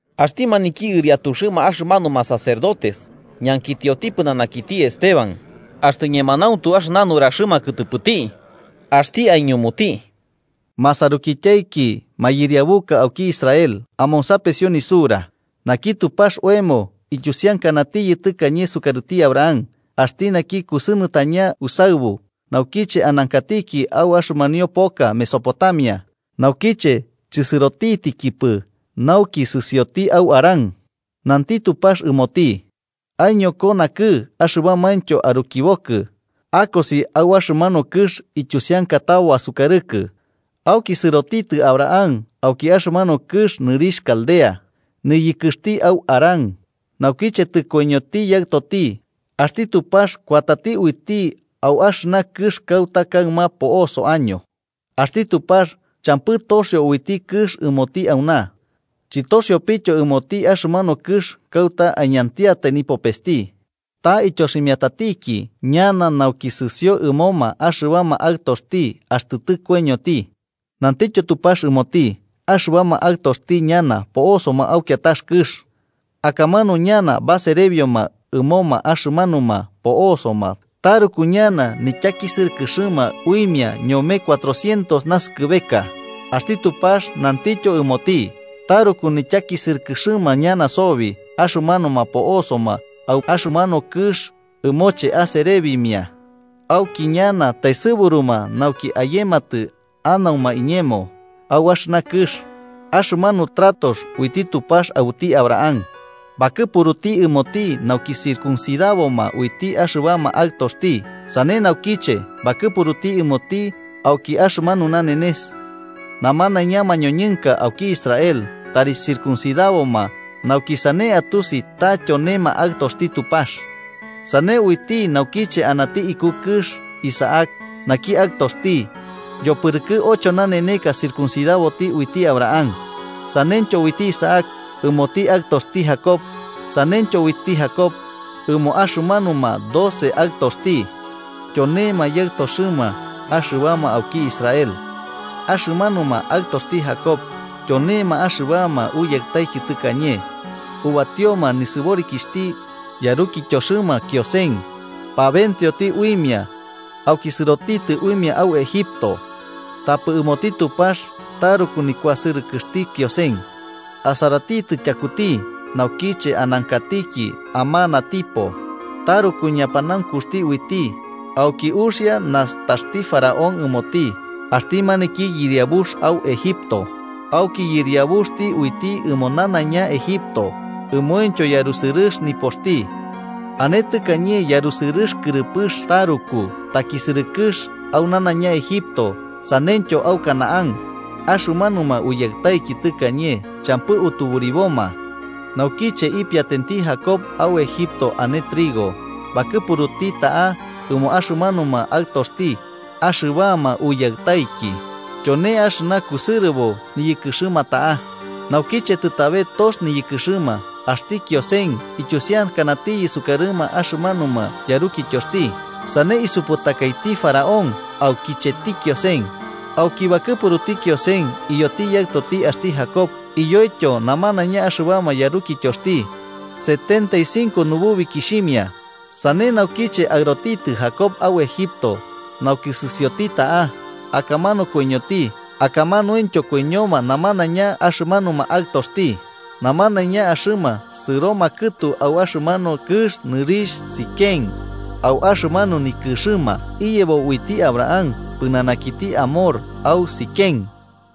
Axti maniki ɨriatuxɨma axɨmanuma sacerdotes ñankitioti pɨnanakiti Esteban axtɨ ñemanauntu axɨna nuraxɨma kɨtɨpɨti, axti aiñumuti: “Masarukityaiki mayɨriabuka auki Israel, amonsapesio nisura: Naki Tupax oemo, ityusiankanatiyɨ tɨkañe sukarɨti Abraham axti naki kusɨnɨtañati usaɨbu naukiche anankati au axɨmanio poka Mesopotamia, naukiche chɨsɨrotitɨkipɨ nauki sɨsioti au Harán, nanti Tupax ɨmoti: ‘Aiñoko nakɨ'ɨ axɨbamaintyo arukibokɨ, akosi au axɨmanu kɨx ityusiankatabo asukarɨkɨ.’ Auki sɨrotitɨ Abraham auki axɨmanu kɨx nɨrixh Caldea, niyɨkɨxti au Harán. Naukiche tɨkoiñoti yaɨtoti, axti Tupax kuatati uiti au axɨna kɨx kauta kaɨma po'osoaño. Axti Tupax champɨ toxio uiti kɨx ɨmoti auna. Chɨtoxiopityo ɨmoti axɨmanu kɨx kauta aiñantiatai nipopesti. Ta ityoximiatatiki ñana nauki sɨsio ɨmoma axɨbama aɨtoxti axtɨ tɨkoiñoti. Nantityo Tupax ɨmoti axɨbama aɨtoxti ñana po'osoma au kiatax kɨx. Akamanu ñana baserebioma ɨmoma axɨmanuma po'oso, taruku ñana nityakisɨrɨkɨxɨma uimia ñome cuatrocientos naskɨbeka. Axti Tupax nantityo ɨmoti: ‘Taruku nityakisɨrɨkɨxɨma ñana sobi axɨmanuma po'osoma au axɨmanu kɨx ɨmoche aserebimia. Auki ñana taesɨburuma nauki ayematɨ anauma iñemo au axɨna kɨx.’ Axɨmanu tratox uiti Tupax aɨbuti Abraham, bakɨpuruti ɨmoti nauki circuncidaboma uiti axɨbama aɨtoxti. Sane naukiche, bakɨpuruti ɨmoti auki axɨmanu nanenes, namanaiña mañoñɨnka auki Israel tari circuncidaboma nauki sane atusi ta tyonema aɨtoxti Tupax. Sane uiti naukiche anati iku kɨx Isaac naki aɨtoxti, yopɨrɨkɨ ocho naneneka circuncidaboti uiti Abraham. Saneityo uiti Isaac ɨmoti aɨtoxti Jacob, saneityo uiti Jacob ɨmo axɨmanuma doce aɨtoxti. Tyonema yaɨtoxɨma axɨbama auki Israel. “Axɨmanuma aɨtoxti Jacob, tyonema axɨbama uyaɨtaiki tɨkañe, ubatioma nisɨborikixhti yarukityoxɨma Kiosen, pabenteoti uimia, auki sɨrotitɨ uimia au Egipto. Tapɨ ɨmoti Tupax taruku nikuasɨrɨkɨxti Kiosen. Asaratitɨ tyakuti naukiche anankati amanatipo. Taruku ñapanaunkuxti uiti, auki uxia nastaxti Faraón ɨmoti, axti maniki yɨriabux au Egipto, auki yɨriabuxti uiti ɨmo nanaiña Egipto, ɨmointyo yarusɨrɨx nipoxti. “Ane tɨkañe yarusɨrɨx kɨrɨpɨx taruku takisɨrɨkɨx au nanaiña Egipto saneityo au Canaán, axɨmanuma uyaɨtaiki tɨkañe champɨ utuburiboma. Naukiche ipiatenti Jacob au Egipto ane trigo, bakɨpuruti ta'a ɨmo axɨmanuma aɨtoxti, axɨbama uyaɨtaiki. Tyone axɨna kusɨrɨbo niyɨkɨxɨma ta'a. Naukiche tɨtabe tox niyɨkɨxɨma, axti Kiosen ityusiankanatiyɨ sukarɨma axɨmanuma yarukityoxti, sane isuputakaiti Faraón aukicheti Kiosen. Auki bakɨpuruti Kiosen iyoti yaɨtoti axti Jacob iyoityo namanaiña axɨbama yarukityoxti, setenta y cinco nububikixhimia. Sane naukiche aɨrotitɨ Jacob au Egipto nauki sɨsioti ta'a. Akamanu koiñoti, akamanuintyo koiñoma namanaiña axɨmanuma aɨtoxti. Namanaiña axɨma sɨroma kɨtu au axɨmanu kɨx nɨrixh Siquem, au axɨmanu nikɨxɨma iyebo uiti Abraham pɨnanakiti Hamor au Siquem.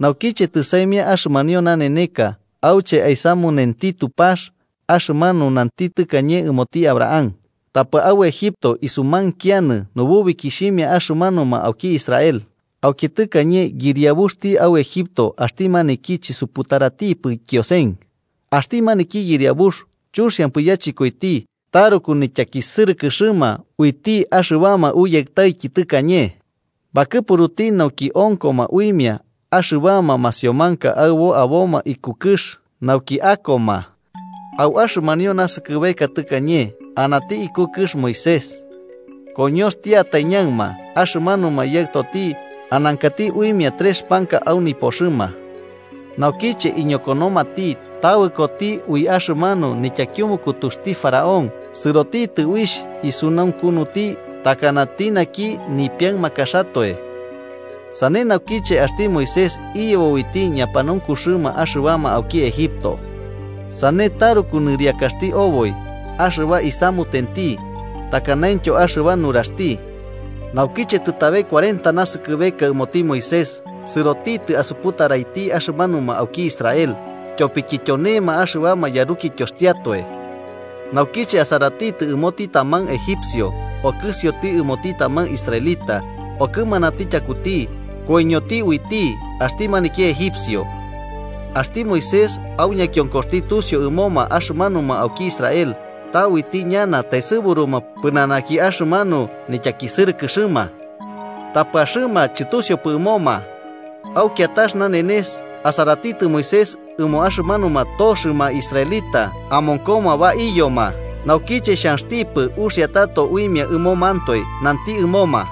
“Naukiche tɨsaimia axɨmanio naneneka auche aisamunenti Tupax axɨmanu nanti tɨkañe ɨmoti Abraham, tapɨ au Egipto isumainkianɨ nububikixhimia axɨmanuma auki Israel. Auki tɨkañe yɨriabuxti au Egipto axti maniki chisuputaratipɨ Kiosen. Axti maniki yɨriabux chuxiampɨ yachɨkoiti taruku nityakisɨrɨkɨxɨma uiti axɨbama uyaɨtaiki tɨkañe. Bakɨpuruti nauki onkoma uimia axɨbama masiomanka aɨbo aboma iku kɨx, nauki akoma. Au axɨmanio naskɨbeka tɨkañe anati iku kɨx Moisés. Koñoxtiatai ñaɨma, axɨmanuma yaɨtoti anankati uimia trex panka au nipoxɨma. Naukiche iñokonomati, tabɨkoti ui axɨmanu nityakiumukutuxti faraón sɨrotitɨ uixh isunaunkunuti takanati naki nipiaɨmakaxatoe. Sane naukiche axti Moisés iyebo uiti ñapanaunkuxɨma axɨbama auki Egipto, sane taruku nɨriakaxti oboi axɨba isamutenti takanaintyo axɨba nuraxti. Naukiche tɨtabe cuarenta nasɨkɨbeka ɨmoti Moisés, sɨrotitɨ asuputaraiti axɨmanuma auki Israel, tyopiki tyonema axɨbama yarukityoxtiatoe. Naukiche asaratitɨ ɨmoti taman egipcio okɨsioti ɨmoti taman israelita, okɨmanati tyakuti, koiñoti uiti axti maniki egipcio. Axti Moisés au ñakionkoxti tusiu ɨmoma axɨmanuma auki Israel ta uiti ñana taesɨburuma pɨnanaki axɨmanu nityakisɨrɨkɨxɨma. Tapɨ axɨma chɨtusiupɨ ɨmoma. Au kiatax nanenes asaratitɨ Moisés ɨmo axɨmanuma toxɨma israelita amonkoma baiyoma, naukiche xhanxtipɨ uxia tato uimia ɨmomantoe, nanti ɨmoma: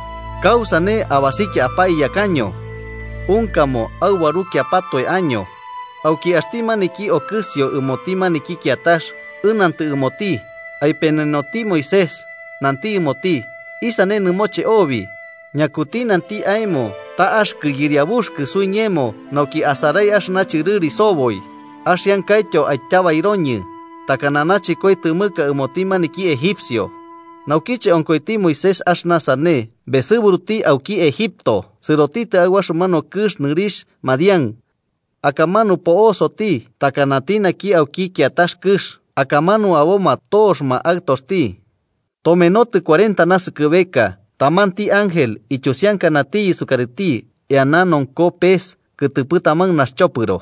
¿Kausane abasikia apaiyakaño? ‘Unkamo aubarukiapatoe año.’ Auki axti maniki okɨsioti ɨmoti maniki kiatax ɨnantɨ ɨmoti aipenenoti Moisés, nanti ɨmoti: ¡Isane nɨmoche obi! ‘¿Ñakuti nanti aemo ta axɨkɨ yɨriabuxɨkɨ suiñemo nauki asarai axɨna chɨrɨri soboi? ¿Axiankaityo aityabairoñɨ, takana nachɨkoi tɨmɨka ɨmoti maniki egipcio?’ Naukiche onkoiti Moisés axɨna sane, besɨburuti auki Egipto sɨrotitɨ au axɨmanu kɨx nɨrixh Madián. Akamanu po'osoti takanati naki auki kiatax kɨx, akamanu aboma toxɨma aɨtoxti. “Tomenotɨ cuarenta naskɨbeka, tamanti ángel ityusiankanatiyɨ sukarɨti eana nonko pes kɨtɨpɨ taman naxchopɨro.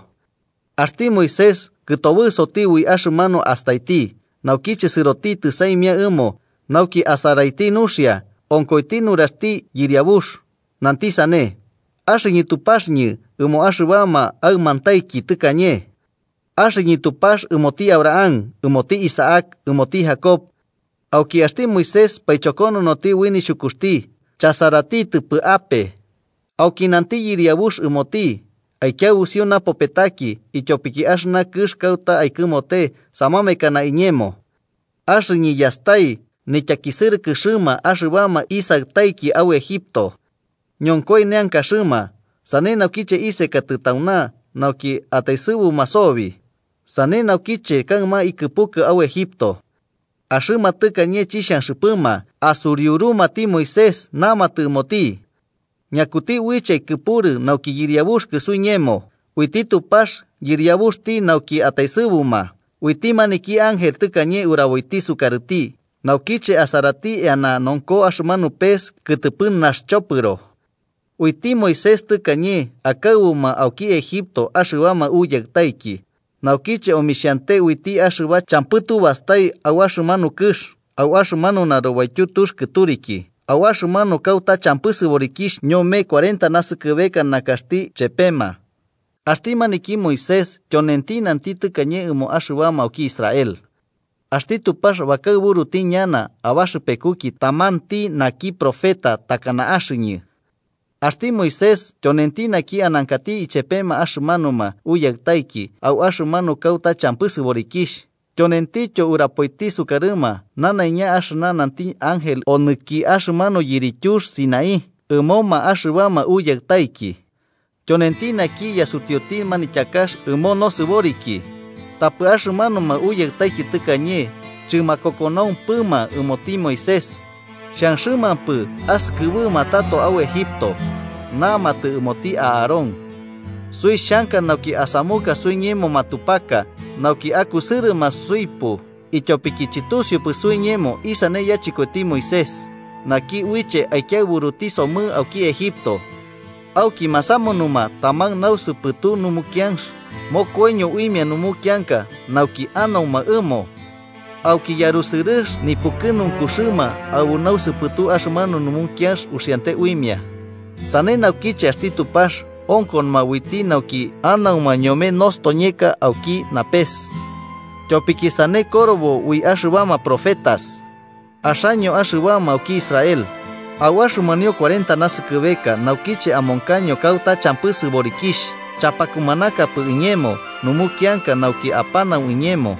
Axti Moisés kɨtobɨsoti ui axɨmanu astaiti, naukiche sɨrotitɨ saimia ɨmo, nauki asaraiti nuxia, onkoiti nuraxti Yɨriabux, nanti sane: ‘Axɨñɨ Tupaxɨñɨ ɨmo axɨbama aɨmantaiki tɨkañe. Axɨñɨ Tupax ɨmoti Abraham, ɨmoti Isaac, ɨmoti Jacob.’ Auki axti Moisés paichokononoti ui nixhukuxti, chasaratitɨpɨ ape. Auki nanti Yɨriabux ɨmoti: ‘Aikiaɨbusio napopetaki ityopiki axɨna kɨx kauta aikɨmote samamekana iñemo. Axɨñɨ yastai nityakisɨrɨkɨxɨma axɨbama isaɨtaiki au Egipto. Ñonkoi neankaxɨma, sane naukiche isekatɨ tauna nauki ataesɨbuma sobi. Sane naukiche kaɨma ikɨpukɨ au Egipto.’ “Axɨma tɨkañe chixhanxɨpɨma asuriurumati Moisés namatɨ ɨmoti: ‘¿Ñakuti uiche aikɨpurɨ nauki yɨriabuxɨkɨ suiñemo?’, uiti Tupax yɨriabuxti nauki ataesɨbuma, uiti maniki ángel tɨkañe uraboiti sukarɨti naukiche asarati eana nonko axɨmanu pes kɨtɨpɨ naxchopɨro. Uiti Moisés tɨkañe akaɨbuma auki Egipto axɨbama Uyaɨtaiki, naukiche omixhante uiti axɨba champɨ tubastai au axɨmanu kɨx, au axɨmanu narubaityu tux kɨturiki, au axɨmanu kauta champɨ sɨborikixh ñome kuarenta naskɨbeka nakaxti chepema. Axti naki Moisés tyonenti nanti tɨkañe ɨmo axɨbama auki Israel: ‘Axti Tupax bakaɨburuti ñana abaxɨpekuki tamanti naki profeta takana axɨñɨ.’ Axti Moisés tyonenti naki anankati ichepema axɨmanuma uyaɨtaiki au axɨmanu kauta champɨ sɨborikixh, tyonentityo urapoiti sukarɨma nanaiña axɨna nanti ángel onɨki axɨmanu yirityux Sinaí ɨmoma axɨbama uyaɨtaiki. Tyonenti naki yasutiuti manityakax ɨmo nosɨboriki. Tapɨ axɨmanuma uyaɨtaiki tɨkañe chɨmakokonaumpɨma ɨmoti Moisés, xhanxɨmampɨ asɨkɨbɨma tato au Egipto. Namatɨ ɨmoti Aarón: ‘Suixhanka nauki asamuka suiñemo matupaka, nauki akusɨrɨma suipu, ityopiki chɨtusiupɨ suiñemo isane yachɨkoiti Moisés, naki uiche aikiaɨburuti somɨ auki Egipto.’ Auki masamunuma taman nausɨpɨtu numukianx, mokoiño uimia numukianka nauki anauma ɨmo. Auki yarusɨrɨx nipukɨnunkuxɨma aɨbu nausɨpɨtu axɨmanu numukianx uxiante uimia. Sane naukiche axti Tupax onkonoma uiti nauki anauma ñome nostoñeka auki napes. Tyopiki sane korobo ui axɨbama profetas: ‘Axaño axɨbama auki Israel, ¿au axɨmanio cuarenta naskɨbeka naukiche amonkaño kauta champɨ sɨborikixh chapakumanakapɨ iñemo numukianka nauki apanau iñemo?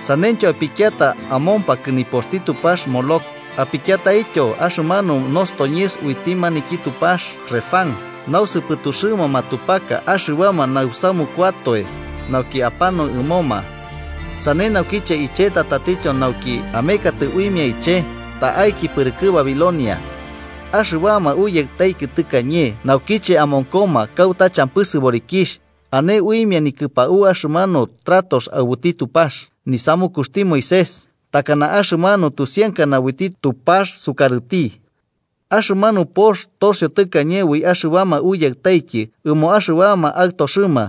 Saneityo, apikiata amompakɨ nipoxti tupax Moloc apikiataityo axɨmanu nostoñes uiti tupax Refán nausɨpɨtuxɨma matupaka axɨbama nausamukuatoe nauki apanau ɨmoma. Sane naukiche icheta tatityo nauki amekatɨ uimia iche ta'aiki pɨrɨkɨ Babilonia.’ Axɨbama uyaɨtaiki tɨkañe naukiche amonkoma kauta champɨ sɨborikixh, ane uimia nikɨpau axɨmanu tratox aɨbuti Tupax, nisamukuxti Moisés, takana axɨmanu tusiankana uiti Tupax sukarɨti. Axɨmanu pox toxio tɨkañe ui axɨbama uyaɨtaiki ɨmo axɨbama aɨtoxɨma,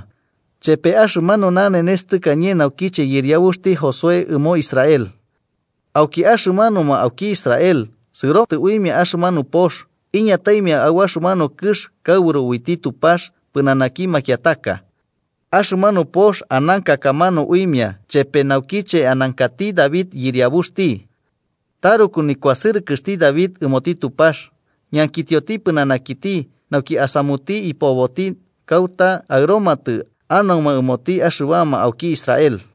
chepe axɨmanu nanenes tɨkañe naukiche yɨriabuxti Josué ɨmo Israel. Auki axɨmanuma auki Israel sɨrotɨ uimia axɨmanu pox iñataimia au axɨmanu kɨx kaɨburu uiti Tupax pɨnanaki makiataka. Axɨmanu pox ananka akamanu uimia chepe naukiche anankati David yɨriabuxti. Taruku nikuasɨrɨkɨxti David ɨmoti Tupax, ñankitioti pɨnanakiti nauki asamuti ipoboti kauta aɨromatɨ anauma ɨmoti axɨbama auki Israel.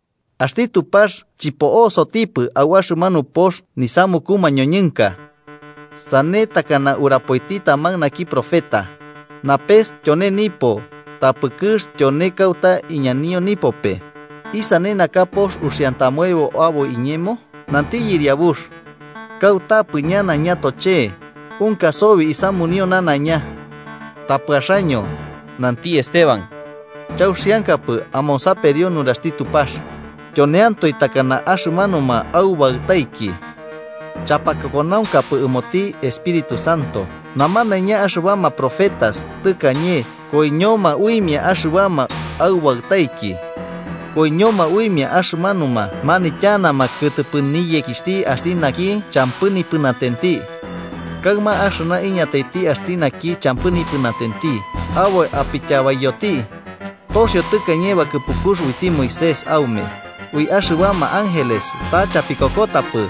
Axti Tupax chɨpo'osotipɨ au axɨna pox nisamuku mañoñɨnka. Sane takana urapoiti taman naki profeta: ‘Napes tyone nipo, tapɨ kɨx tyone kauta iñanio nipope. ¿Isane naka pox uxiantamoebo aboi iñemo?, nanti Yɨriabux. ¿Kautapɨ ñana ñatoche'e, unka sobi isamunio nanaiña?’ “Tapɨ axaño–nanti Esteban–chauxiankapɨ amonsaperio nuraxti Tupax, tyoneantoe takana axɨmanuma aubaɨtaiki. Chapakokonaunkapɨ ɨmoti Espíritu Santo. Namanaiña axɨbama profetas tɨkañe koiñoma uimia axɨbama aubaɨtaiki. Koiñoma uimia axɨmanuma manityanama kɨtɨpɨ niyekixhti axti naki champɨ nipɨnatenti. Kaɨma axɨna iñataiti axti naki champɨ nipɨnatenti, aboi apityabaiyoti. Toxio tɨkañe bakɨpukux uiti Moisés aume ui axɨbama ángeles, ta chapikokotapɨ.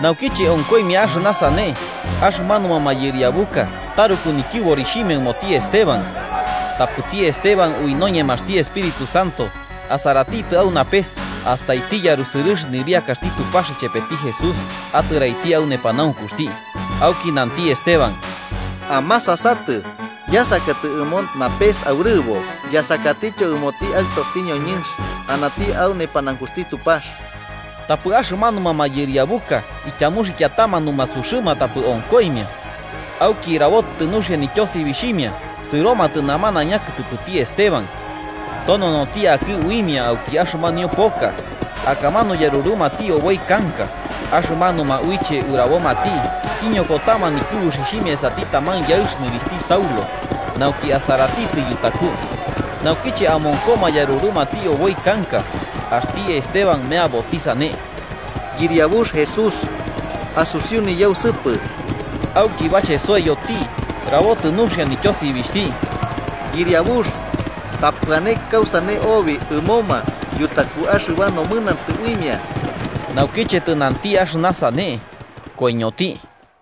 Naukiche onkoimia axɨna sane, axɨmanuma mayɨriabuka taruku nityɨborixhimia ɨmoti Esteban. Tapɨti Esteban ui noñemaxti Espíritu Santo, asaratitɨ au napes astaiti yarusɨrɨx nɨriakaxti Tupax ichepeti Jesús atɨraiti au nepanaunkuxti. Auki nanti Esteban: –¡Amasasatɨ! Yasakatɨ ɨmo napes aurɨbo, yasakatityo ɨmoti Aɨtoxti ñoñɨnx anati au nepanaunkuxti Tupax. Tapɨ axɨmanuma mayɨriabuka ityamuxikiatama numasuxɨma tapɨ onkoimia, auki rabotɨ nuxia nityosibixhimia sɨromatɨ namanaiña kɨtɨpɨti Esteban. Tononoti akɨ uimia auki axɨmanio poka, akamanu yarurumati oboi kanka. Axɨmanuma uiche urabomati iñokotama nikɨbuxixhimia esati taman yaɨx nɨrixhti Saulo, nauki asaratitɨ yutaku. Naukiche amonkoma yarurumati oboi kanka, axti Esteban meaboti sane: “Yɨriabux Jesús, asusiu niyausɨpɨ.” Auki bachesoiyoti rabotɨ nuxia nityosibixhti: “¡Yɨriabux, tapɨ ane kausane obi ɨmoma yutaku axɨba nomɨnantɨ uimia!” Naukiche tɨnanti axɨna sane, koiñoti.